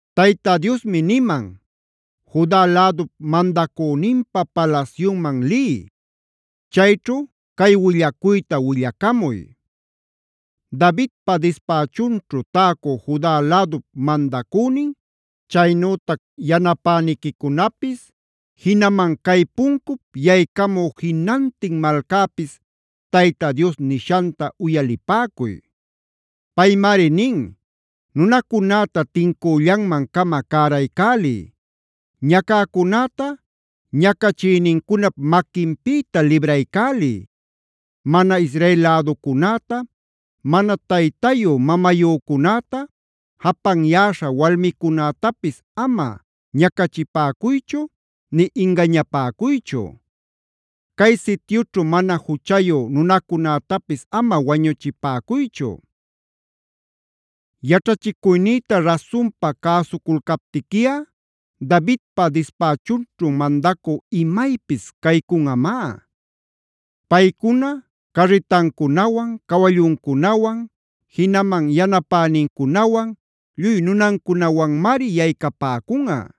Tayta Diosmi niman: “Juda lädup mandacüninpa palasyunman liy; chayćhu cay willacuyta willacamuy: Davidpa dispächunćhu täcü Juda lädup mandacünin, chaynütac yanapäniquicunapis, jinaman cay puncup yaycamü jinantin malcäpis Tayta Dios nishanta uyalipäcuy: Paymari nin: ‘Nunacunäta tincüllanman-cama cäraycäliy. Ñacäcunäta ñacachïnincunap maquinpïta libraycäliy. Mana Israel läducunäta, mana taytayu-mamayücunäta, japanyäśha walmicunätapis ama ñacachipäcuychu nï ingañapäcuychu. Cay sityućhu mana juchayu nunacunätapis ama wañuchipäcuychu. Yaćhachicuynïta rasunpa cäsuculcaptiquiꞌa Davidpa dispächunćhu mandacü imaypis caycunꞌamá. Paycuna carritancunawan, cawalluncunawan, jinaman yanapänincunawan, lluy nunancunawanmari yaycapäcunꞌa.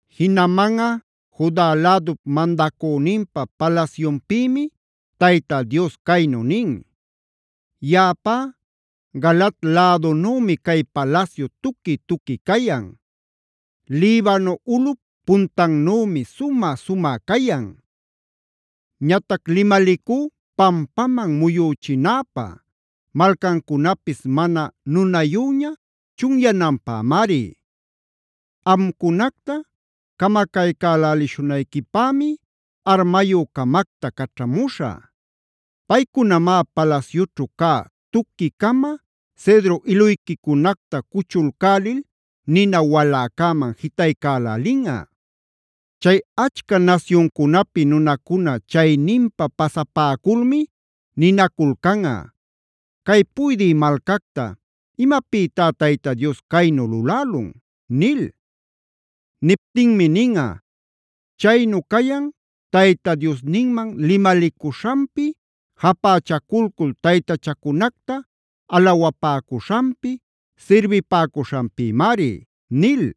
Jinamanꞌa Juda lädup mandacüninpa palasyunpïmi Tayta Dios caynu nin: “Yaꞌapá, Galaad lädunümi cay palasyu tuqui-tuqui cayan; Libano ulꞌup puntannümi sumä-sumä cayan. Ñatac limalicú pampaman muyüchinäpä, malcancunapis mana nunayüña chunyananpämari. Amcunacta camacaycälälishunayquipämi armayü-camacta caćhamuśhä. Paycunamá palasyućhu cä tuqui-cama cedro iluyquicunacta cuchulcälil nina waläcäman jitaycälälinꞌa. “Chay achca nasyuncunapi nunacuna chayninpa pasapäculmi ninaculcanꞌa: ‘Cay puydï malcacta, ¿imapïtá Tayta Dios caynu lulälun?’ nil. Niptinmi ninꞌa: ‘Chaynu cayan Tayta Diosninman limalicuśhanpi japächaculcul taytachacunacta alawapäcuśhanpi, sirbipäcuśhanpïmari’” nil.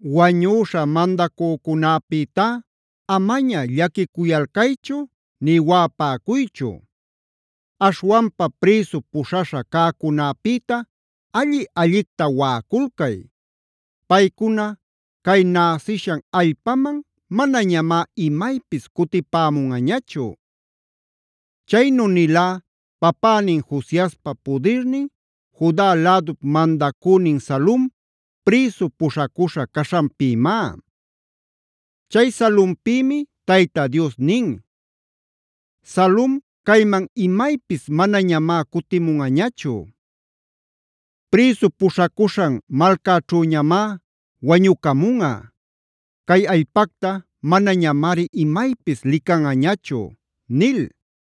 Wañüśha mandacücunäpïtá amaña llaquicuyalcaychu nï waꞌapäcuychu. Aśhwanpa prïsu puśhaśha cäcunäpïta alli-allicta waꞌaculcay. Paycuna cay näsishan allpaman manañamá imaypis cutipämunꞌañachu. Chaynu nilá papänin Josiaspa pudirnin Juda lädup mandacünin Salum prïsu puśhacuśha caśhanpïmá. Chay Salumpïmia Tayta Dios nin: “Salum cayman imaypis manañamá cutimunꞌañachu. Prïsu puśhacuśhan malcaćhüñamá wañucamunꞌa; cay allpacta manañamari imaypis licanꞌañachu” nil.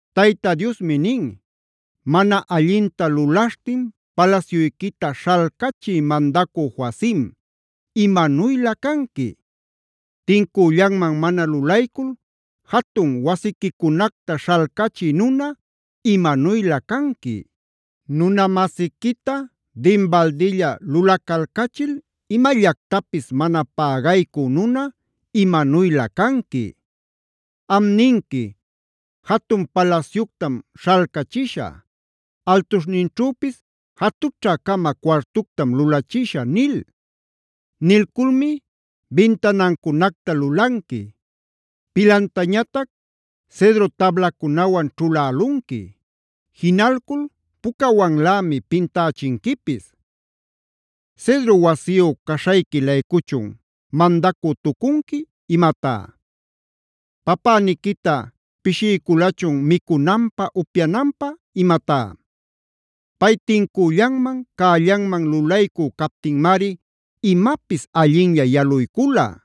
Tayta Diosmi nin: “Mana allinta lulaśhtin palasyuyquita śhalcachï mandacü Joacim, imanuylä canqui. Tincüllanman mana lulaycul jatun wasiquicunacta śhalcachï nuna, imanuylä canqui. Nuna-masiquita dinbaldilla lulacalcachil imallactapis mana pägaycü nuna, imanuylä canqui. Am ninqui: ‘Jatun palasyuctam śhalcachishä; altuśhninćhüpis jatućhä-cama cuartuctam lulachishä’ nil. Nilculmi bintanancunacta lulanqui; pilantañatac cedro tablacunawan ćhulälunqui. Jinalcul pucawanlämi pintächinquipis. ¿Cedro wasiyu caśhayqui-laycuchun mandacü-tucunqui imatá? ¿Papäniquita pishiyculachun micunanpä, upyananpä imatá? Pay tincüllanman, cällanman lulaycü captinmari imapis allinlla yaluycula.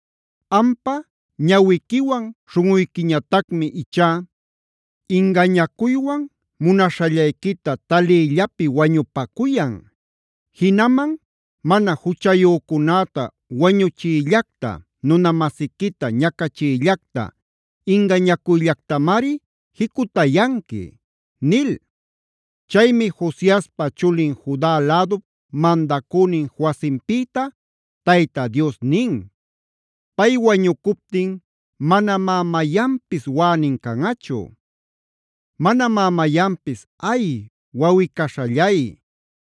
Ampa ñawiquiwan śhunꞌuyquiñatacmi ichá ingañacuywan munaśhallayquita taliyllapi wañupacuyan. Jinaman mana juchayücunäta wañuchiyllacta, nuna-masiquita ñacachiyllacta, ingañacuyllactamari jicutayanqui” nil. Chaymi Josiaspa chulin Juda lädup mandacünin Joacimpïtab Tayta Dios nin: “Pay wañucuptin manamá mayanpis waꞌänin canꞌachu. Manamá mayanpis: ‘¡Ay, wawꞌi-caśhallay!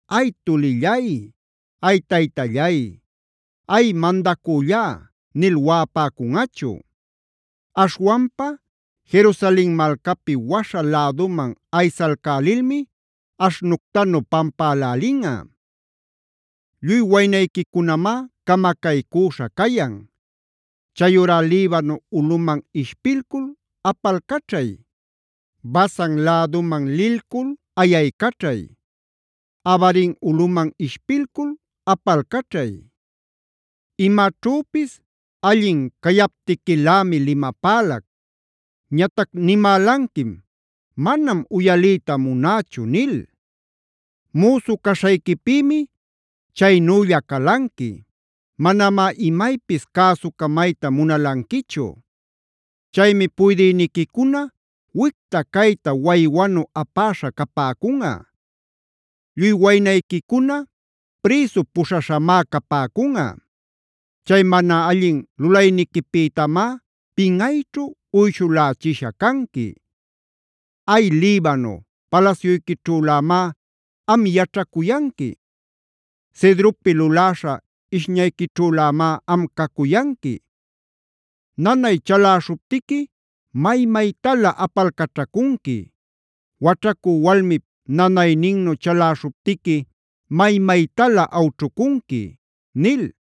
¡Ay, tulillay! ¡Ay, taytallay! ¡Ay, mandacüllá!’ nil waꞌapäcunꞌachu. Aśhwanpa Jerusalen malcapi waśha läduman aysalcälilmi aśhnuctanu pampälälinꞌa. Lluy waynayquicunamá camacaycüśha cayan. Chayurá Libano ulꞌuman ishpilcul apalcaćhay. Basan läduman lilcul ayaycaćhay. Abarim ulꞌuman ishpilcul apalcaćhay. Imaćhüpis allin cayaptiquilämi limapälac. Ñatac nimälanquim: ‘Manam uyaliyta munächu’ nil. Müsu caśhayquipïmi chaynülla calanquilä canpis; manamá imaypis cäsucamayta munalanquichu. Chaymi puydïniquicuna wicta-cayta waywanu apäśha capäcunꞌa; lluy waynayquicuna prïsu puśhaśhamá capäcunꞌa. Chay mana allin lulayniquipïtamá pinꞌayćhu uyshulächisha canqui. Ay, Libano palasyuyquićhülämá am yaćhacuyanqui; cedropi luläśha ishñayquićhülämá am cacuyanqui. Nanay chalaśhuptiqui may-maytalä apalcaćhacunqui; waćhacü walmip nanayninnu chalaśhuptiqui may-maytalä awćhucunqui” nil.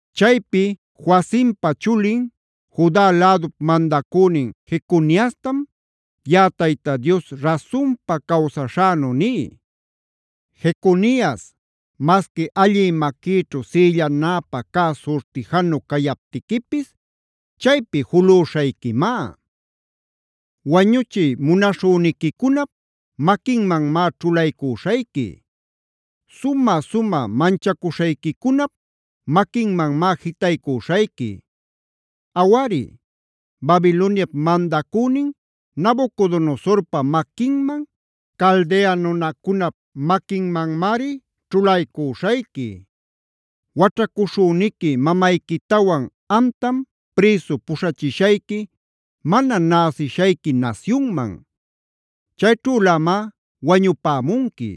Chaypi Joacimpa chulin, Juda lädup mandacünin Jeconiastamc yaꞌaTayta Dios rasunpa cawsaśhänu ní: “Jeconias, masqui allï maquïćhu sïllanäpä cä surtijanu cayaptiquipis, chaypi julüśhayquimá. Wañuchiy munaśhüniquicunap maquinmanmá ćhulaycüśhayqui. Sumä-sumä manchacuśhayquicunap maquinmanmá jitaycüśhayqui. Awari, Babiloniap mandacünin Nabucodonosorpa maquinman, Caldea nunacunap maquinmanmari ćhulaycüśhayqui. Waćhacuśhüniqui mamayquitawan amtam prïsu puśhachishayqui mana näsishayqui nasyunman. Chayćhülämá wañupämunqui.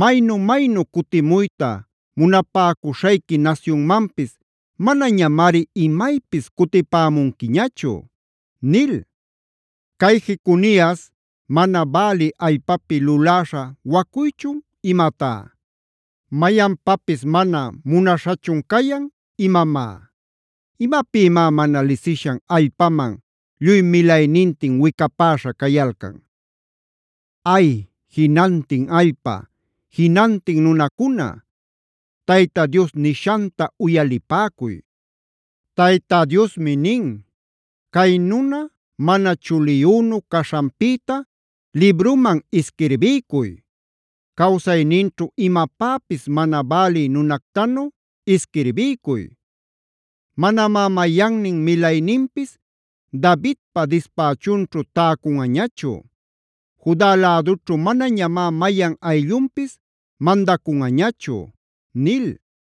Maynu-maynu cutimuyta munapäcuśhayqui nasyunmanpis manañamari imaypis cutipämunquiñachu” nil. Cay Jeconias, ¿mana bälï allpapi luläśha wacuychun imatá? ¿Mayanpapis mana munaśhachun cayan imamá? ¿Imapïmá mana lisishan allpaman lluy milaynintin wicapäśha cayalcan? Ay, jinantin allpa, jinantin nunacuna, Tayta Dios nishanta uyalipäcuy. Tayta Diosmi nin: “Cay nuna mana chuliyünu caśhanpïta libruman isquirbiycuy; cawsayninćhu imapäpis mana bälï nunactanu isquirbiycuy. Manamá mayannin milayninpis Davidpa dispächunćhu täcunꞌañachu; Juda lädućhu manañamá mayan ayllunpis mandacunꞌañachu” nil.